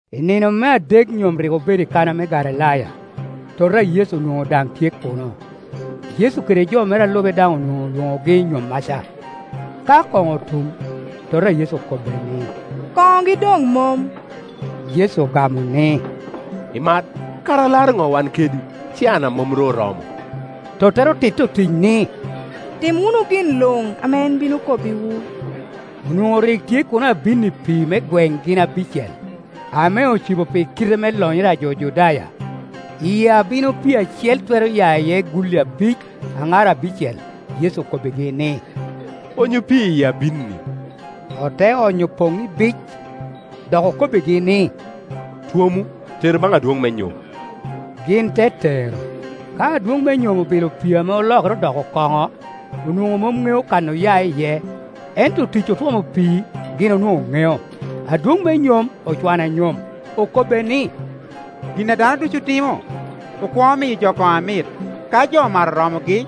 I nino me adek nyom rik obedo i Kana me Galilaya; toto a Yecu onwoŋo daŋ tye kuno. Yecu kede jo mere a lube daŋ onwoŋo olwonogi i nyommaca. Ka koŋo otum, tota a Yecu okobbe ni, “Koŋogi doŋ mom.” Yecu ogamo ni, “Imat, kara alaro ŋo wan kedi? Caana mom ru oromo.” Tottere otitti otic ni, “Tim wunu gin luŋ ame en bino kobbiwu.” Onwoŋo rik tye kuno abinni pii me gweŋ gin abicel, ame ocibo pi kite me lonyere a jo Judaya; i abino pii acel twero ya iye gulli abic, aŋar abicel. Yecu okobbigi ni, “Onyu pii i abinni.” Ote onyo poŋ ibic. Dok okobbigi ni, “Twomu, teru baŋ adwoŋ me nyom;” gin te tero. Ka adwoŋ me nyom obilo pii ame olokere odoko koŋo, onwoŋo mom ŋeo kan oya iye, ento otic otwomo pii gin onwoŋo ŋeo. Adwoŋ me nyom ocwano anyom, okobbe ni, “Gin a dano ducu timo, okwoŋo miyo jo kono amit, ka jo omato oromogi,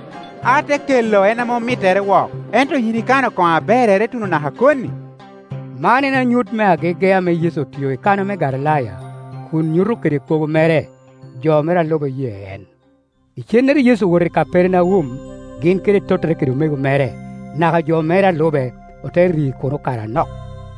ote kelo en a mom mittere wok; ento yin ikano koŋo aberrere tuno naka koni.” Man en anyut me agege ame Yecu otio i Kana me Galilaya, kun nyuto kede kwogo mere; jo mere a lube oye en. Icennere Yecu owoto i Kapernaum, gin kede tottere kede omego mere, naka jo mere a lube, ote ri kuno kare anok.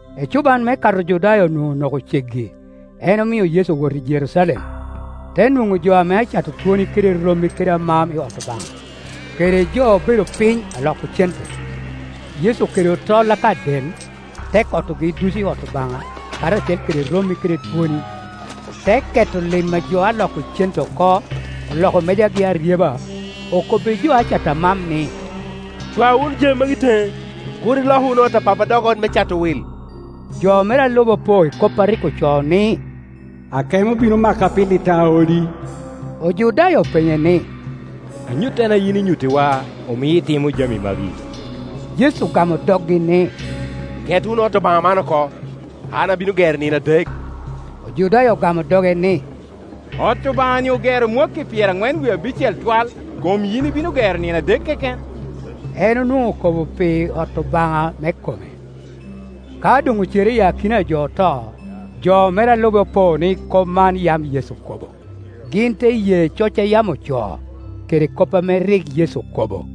Ecuban me Kato Ojudaya onwoŋo onoko ceggi, en omio Yecu owoto i Jerucalem, te nwoŋo jo ame acato twoni kede rommi kede amam i ot Obaŋa, kede jo obedo piny aloko cente. Yecu okedo tol aka del, te kotogi ducu i ot Obaŋa, karacel kede rommi kede twoni, te ketto lim a jo aloko cente oko, oloko mejagi aryeba. Okobbi jo a cato amam ni, “Cwa wunu jami magi teŋe; kur iloku ot a Pappa dok ot me cato wil.” Jo mere a lube opo i kop a rik ocoo ni, “Akemo bino maka pi lit a odi.” Ojudaya openye ni, “Anyuttene a yin inyuttiwa omio itimo jami magi?” Yecu ogamo doggi ni, “Ket wunu ot Obaŋa man oko, an abino gero nino adek.” Ojudaya ogamo doge ni, “Ot Obaŋa-ni ogero mwakki pyeraŋwen wie abicel twal, kom yin ibino gero nino adek keken?” En onwoŋo okobo pi ot Obaŋa me kome. Ka doŋ ocere i akina a jo oto, jo mere a lube opo ni kop man yam Yecu okobo; gin te ye coc a yam ocoo, kede kop ame rik Yecu okobo.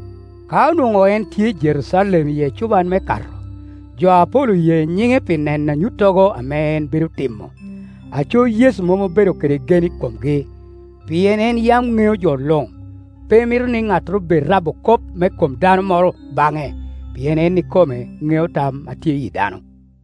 Ka onwoŋo en tye i Jerucalem i ecuban me Kato, jo apol oye nyiŋe pi neno anyuttogo ame en bedo timo. Aco Yecu mom obedo kede gen i komgi, pien en yam ŋeo jo luŋ, pe mito ni ŋattoro bed rabo kop me kom dano moro baŋe, pien en ikome ŋeo tam a tye i yi dano.